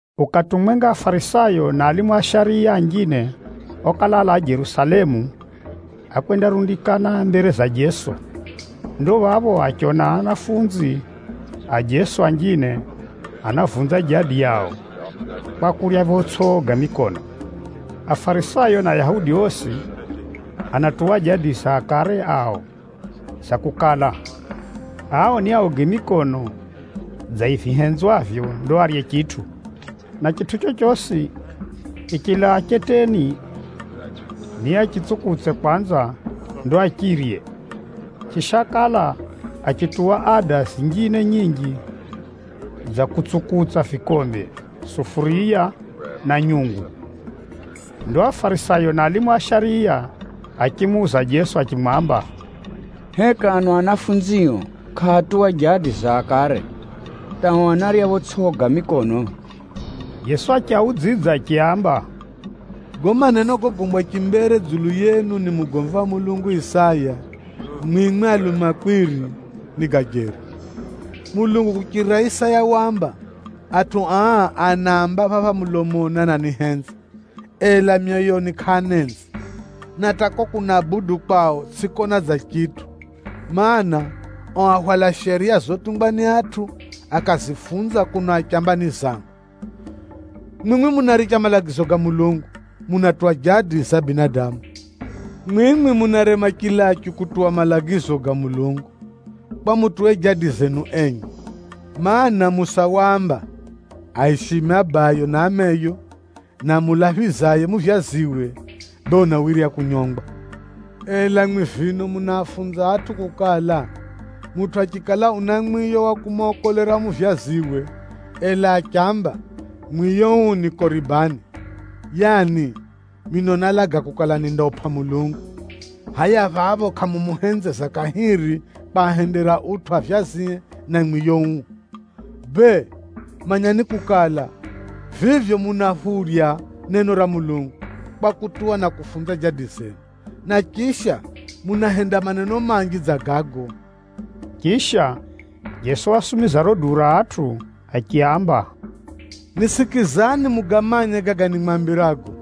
Ukati umwenga, Afarisayo na alimu a shariya anjine okala alaa Jerusalemu, ákwendarundikana mbere za Jeso. Ndo phapho achiona anafunzi a Jeso anjine anavunza jadi yao, kwa kurya photsʼi koga mikono. Afarisayo na Ayahudi osi, anatuwa jadi za akare ao, za kukala, ao niaoge mikono dza vihenzwavyo, ndo arye chitʼu. Na chitʼu chochosi chichilaa cheteni, niachitsukutse kwanza, ndo achirye. Chisha, ákala achituwa ada zinjine nyinji dza kutsukutsa vikombe, sufuriya na nyungu. Ndo Afarisayo na alimu a shariya achimuuza Jeso achimwamba, “Heka ano anafunzio kʼaatuwa jadi za akare, hata ao anarya photsʼi koga mikono?” Jeso achiaudzidza achiaamba, “Gago maneno gogombwa chimbere dzulu yenu ni mugomvi wa Mulungu Isaya, mwimwi alumakwiri, ni ga jeri. Mulungu kuchirira Isaya waamba, ‘Atʼu aa anaamba mulomoni ananihenza, ela myoyoni kʼaanenzi. Na hata kuko kunabudu kwao, tsʼikona dza chitʼu. Mana, ao ahwala shariya zotungwa ni atʼu, akazifunza kuno achamba ni zangu!’ “Mwimwi munaricha malagizo ga Mulungu, munatuwa jadi za binadamu. “Mwimwi munarema chilachu kutuwa malagizo ga Mulungu, kwa mutuwe jadi zenu enye! Maana, Musa waamba, ‘Aishime abayo na ameyo,’ na ‘Amulaphizaye muvyaziwe, bee unawirya kunyongwa.’ Ela mwimwi vino munaafunza atʼu kukala, ‘Mutʼu achikala una mwiyo wa kumokolera muvyaziwe, ela achiamba, “Mwiyo uu ni koribani,” ’ yaani, (mino nálaga kukala nindaupʼa Mulungu), hʼaya phapho kʼamumuhenzeza kahiri kwahendera utʼu avyazie na mwiyo uo. Bee, manyani kukala, vivyo munaphurya neno ra Mulungu, kwa kutuwa na kufunza jadi zenu. Na chisha, munahenda maneno manji dza gago.” Chisha, Jeso wasumiza riro duu ra atʼu, achiaamba, “Nisikizani mugamanye gaga nimwambirago.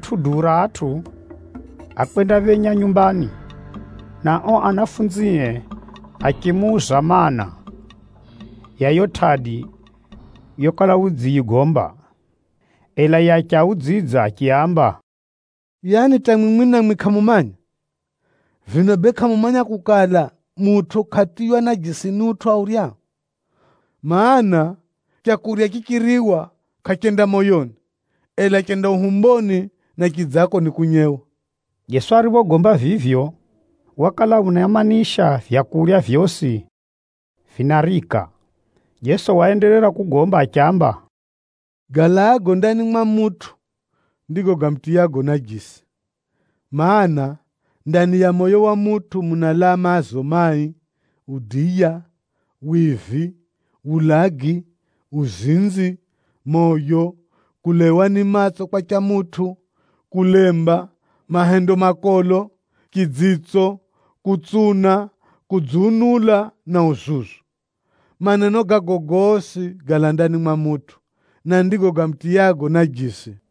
Ariphoricha riratʼu duu ra atʼu, ákwendaphenya nyumbani, na ao anafunzie achimuuza maana, ya yiyo tʼadi yokala udziyigomba. Ela yiye achiaudzidza achiaamba, “Yaani hata mwimwi namwi kʼamumanya? Vino bee kʼamumanya kukala, mutʼu kʼatiywa najisi ni utʼu auryao? Maana, leu richiriwa kʼarenda moyoni, ela renda uhumboni, na chidzako nikunyewa.” (Jeso ariphogomba vivyo, wakala unaimanisha maleu gosi ganarika.) Jeso waenderera kugomba achiamba, “Galaago ndani mwa mutʼu, ndigo gamutiyago najisi. Mana, ndani ya moyo wa mutʼu munalaa maazo mai, udiya, wivi, wulagi, uzinzi, moyo, kulaiwa ni matso kwa cha mutʼu, kulemba, mahendo makolo, chidzitso, kutsuna, kudziunula na uzuzu. Maneno gago gosi, galaa ndani mwa mutʼu, na ndigo gamutiyago najisi.”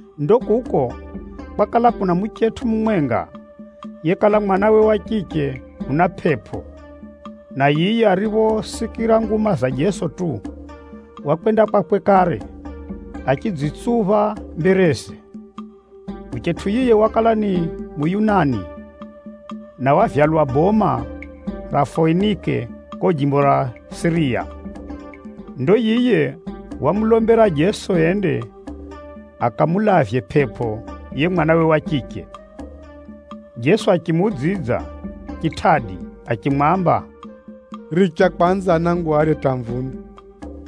Ndo kuko kwakala kuna muchetʼu mumwenga, yekala mwanawe wa chiche una pʼepʼo, na yiye ariphosikira nguma za Jeso tu, wakwenda kwakwe kare, achidzitsupha mbereze. Muchetʼu yiye wakala ni Muyunani, na wavyalwa boma ra Foinike kuko jimbo ra Siriya. Ndo yiye wamulombera Jeso ende akamulavye pʼepʼo yiye mwanawe wa chiche. Jeso achimuudzidza chitʼadi achimwamba, “Richa kwanza anangu arye hata amvune,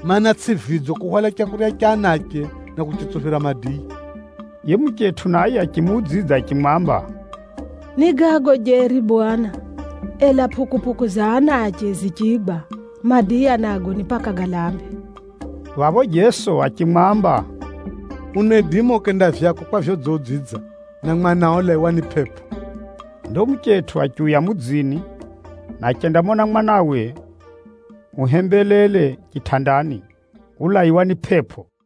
mana, tsʼi vidzo kuhwala leu ra anache, na kuritsuphira madiya.” Yiye muchetʼu naye achimuudzidza achimwamba, “Ni gago jeri Bwana, ela pʼukupʼuku za anache zichigwa, madiya nago ni paka galambe.” Phapho Jeso achimwamba, “Unaidima ukenda vyako kwa vyodziudzidza, na mwanao ulaiwa ni pʼepʼo.” Ndo muchetʼu achiuya mudzini, na achendamona mwanawe uhembelele chitʼandani, ulaiwa ni pʼepʼo.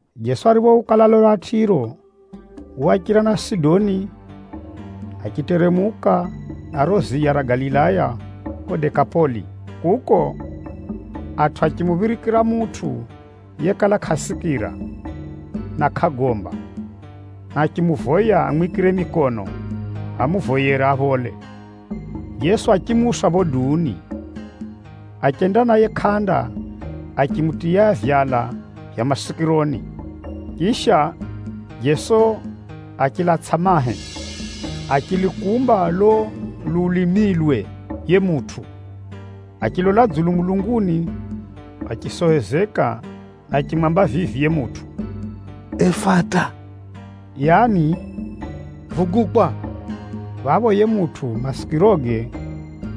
Jeso ariphouka lalo ra Tʼiro, wachira na Sidoni, achiteremuka na riro ziya ra Galilaya kuko Dekapoli. Kuko, atʼu achimuphirikira mutʼu yekala kʼasikira na kʼagomba, na achimuvoya amwikire mikono amuvoyere aphole. Jeso achimuusa phapho duuni, achenda naye kʼanda achimutiya vyala vya masikironi. Chisha, Jeso achilatsʼa mahe, achilukumba lulo lulimilwe yiye mutʼu. Achilola dzulu mulunguni, achisohozeka na achimwamba vivi yiye mutʼu, “Efata,” yaani “Vugukwa!” Phapho yiye mutʼu masikiroge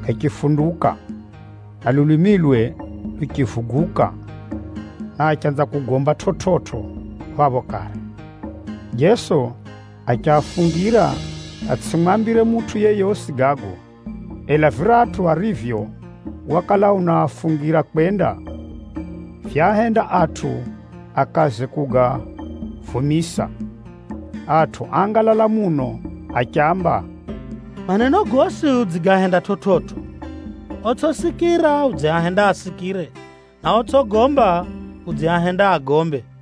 gachifunduka, na lulimilwe luchivuguka, na achanza kugomba chividzo phapho kare. Jeso achiafungira atsʼimwambire mutʼu yeyosi gago, ela viratʼu arivyo wakala unaafungira kwenda, vyaahenda atʼu akaze kugavumisa. Atʼu áangalala muno achiamba, “Maneno gosi udzigahenda chividzo! Otsʼisikira, udziahenda asikire, na otsʼigomba udziahenda agombe.”